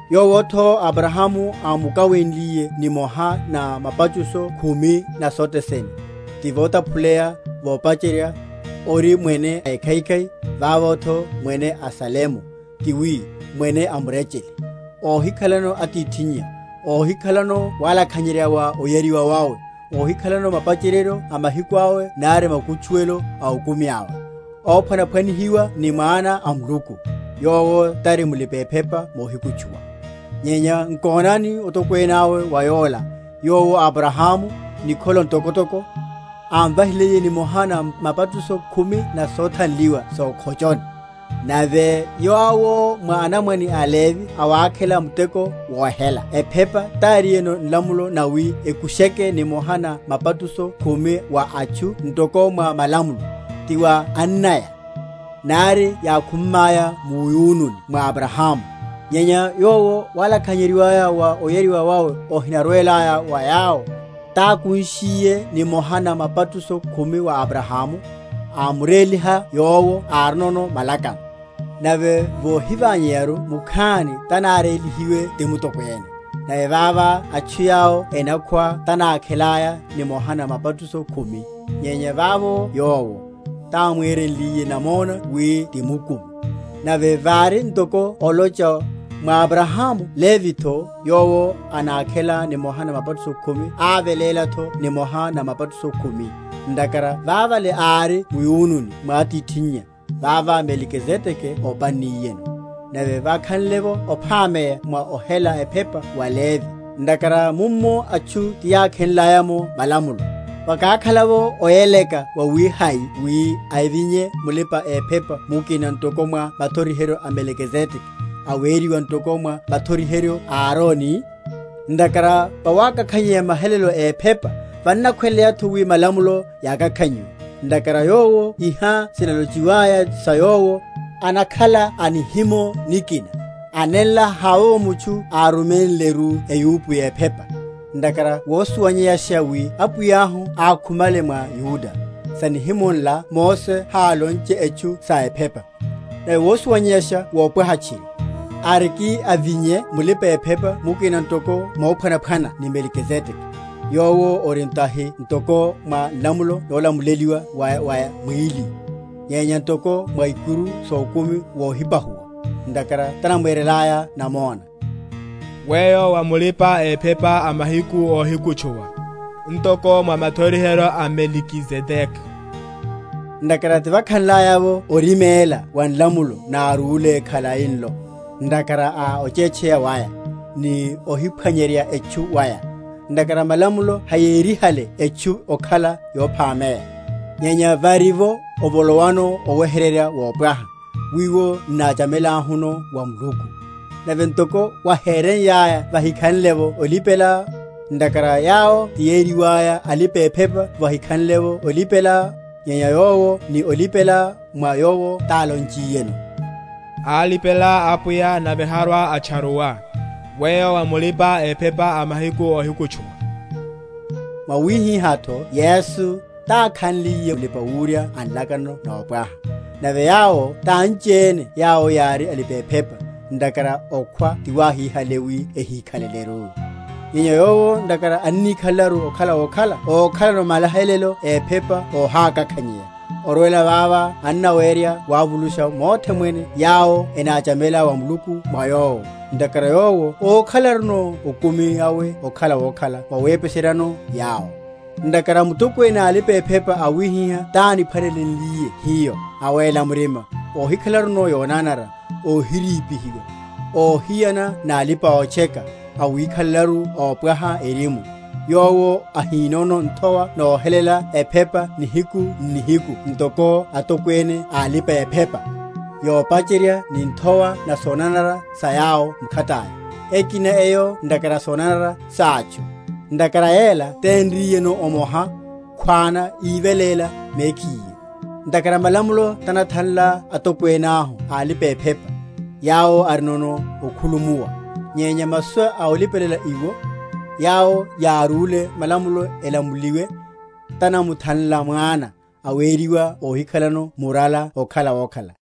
yowotho Abrahamu ámukawenliye nimoha na mapatusho khumi na sothe sene (ti votaphuleya, vopacherya, ori Mwene ékhaikhai, vavotho Mwene a Salemu, ti wi, Mwene a murechele; óhikhalano atithinnya, óhikhalano walakhanyerya wa oyariwa wawe, óhikhalano mapacheryeryo a mahiku awe nari makutchuwelo a okumi awe, óphwanaphwa‐nihiwa ni Mwana a Muluku), yowo tari mulipa‐ephepa mohikutchuwa. Nyenya nkonani otokwene awe wa yola, yowo Abrahamu, nikholo ntokotoko, ámvahiliye nimoha na mapatusho khumi na sothanliwa sókhochoni. Nave yawo mwa anamwane a Levi awákhela muteko wohela ephepa tárinono nlamulo nawi ekusheke nimoha na mapatusho khumi wa atchu ntoko mwa malamulo, ti wa annaya, nari yákhummaya muyununi mwa Abrahamu; nyenya yowo walakhanyeryiwa wa oyariwa wawe ohinarwelaya wa yawo, tákunshiye nimoha na mapatusho khumi wa Abrahamu, amuréliha yowo árinono malakano. Nave vohiványeyaru mukhani tanárélihiwe ti mutokwene. Nave vava atchu yawo enokhwa tanákhelaya nimoha na mapatusho khumi, nyenya vavo yowo, támwerenliye namona wi ti mukumi. Nave vari ntoko olocha, Mwa Abrahamu Levitho yowo anákhela nimoha na mapatusho khumi ávelélatho nimoha na mapatusho khumi; ntakhara vavale ári muyununi mwa atithinnya, vava Melikizedeke ópanniyeno. Nave vákhanle’vo ophameya mwa ohela ephepa wa aLevi (ntakhara mummo atchu tiyákhenlaya’mo malamulo), vakákhala’vo oyeleka wawihai wi avinye mulipa‐ephepa mukina ntoko mwa mathoriheryo a Melikizedeke, aweriwa ntoko mwa mathoriheryo a Aroni? Ntakhara vawakakhanyeya mahelelo éphepa, vannakhweleyatho wi malamulo yakakhanyiwe. Ntakhara Yowo iha sinalochiwaya sa Yowo, anakhala a nihimo nikina, a nenla havovo mutchu áruménleru eyupo yephepa. Ntakhara wosuwanyeyasha wi Apwiyahu ákhumale mwa Yuda; sa nihimo nla Mose hálonche etchu sa ephepa. Nave wosuwanyeyasha wopwaha tchiri, arikiavinye mulipa‐ephepa mukina ntoko mophwanaphwana ni Melikizedeke, yowo ori tahi ntoko mwa nlamulo nolamuleliwa wa wa mwíli, nyenya ntoko mwa ikuru sókumi wohipahuwa; ntakhara tanamwerelaya namona, Weyo wa mulipa‐ephepa a mahiku óhikutchuwa Ntoko mwa mathoriheryo a Melikizedeke. Ntakhara tivákhanlaya’vo oriméla wa nlamulo nárúle khali nlo, ntakhara a ochetcheya waya, ni ohiphwanyerya etchu waya, (ntakhara malamulo hayérihale etchu okhala yophameya), nyenya varivo ovolowano oweheryerya wopwaha, wiwo n’náchamelahuno wa Muluku. Nave ntoko wahéreiyaya vahikhanlevo olipela; (ntakhara yawo tiyeriwaya alipa‐ephepa vahikhanlevo olipela; nyenya Yowo ni olipela mwa Yowo tálonchiyeno, Álipela Apwiya nave harwa‐atcharuwa, Weyo wa mulipa‐ephepa a mahiku óhikutchuwa). Mwawihihátho Yesu tákhanliye Mulipa‐wurya a nlakano nopwaha. Nave yawo tanchiene yawo yári alipa‐ephepa, ntakhara okhwa tiwáhíhale wi ehíkhaleleru; nyenya Yowo ntakhara annikhalelaru okhala wokhala okhalano mahelelo ephepa óhakakhanyeya, orwela vava annawerya wavulusha mothe mwene yawo enáchamela wa Muluku mwa Yowo, ntakhara Yowo ókhalanoru okumi awe okhala wokhala wowepeseryano yawo. Ntakhara Mutokwene a alipa‐ephepa awihiha tániphwanelenliye hiyo, awéla murima, óhikhalanoru yonanara, óhirípihiwa, óhiyana nalipa‐otcheka, awikhalelaru ópwaha erimu; yowo ahinono nthowa nohelela ephepa nihiku n’nihiku ntoko atokwene a alipa‐ephepa, yopacherya ni nthowa na sonanara sa yawo mkhataya, ekina eyo ntakhara a sonanara sátchu; ntakhara yela ténriyeno omoha, khwana, ívelénliye mekhiye. Ntakhara malamulo tanathanla atokwene ahu a alipa‐ephepa, yawo arinono okhulumuwa; nyenya masu a olipela iwo, yawo yárúle malamulo elamuliwe, tanamuthanla Mwana, aweriwa óhikhalano murala okhala wokhala.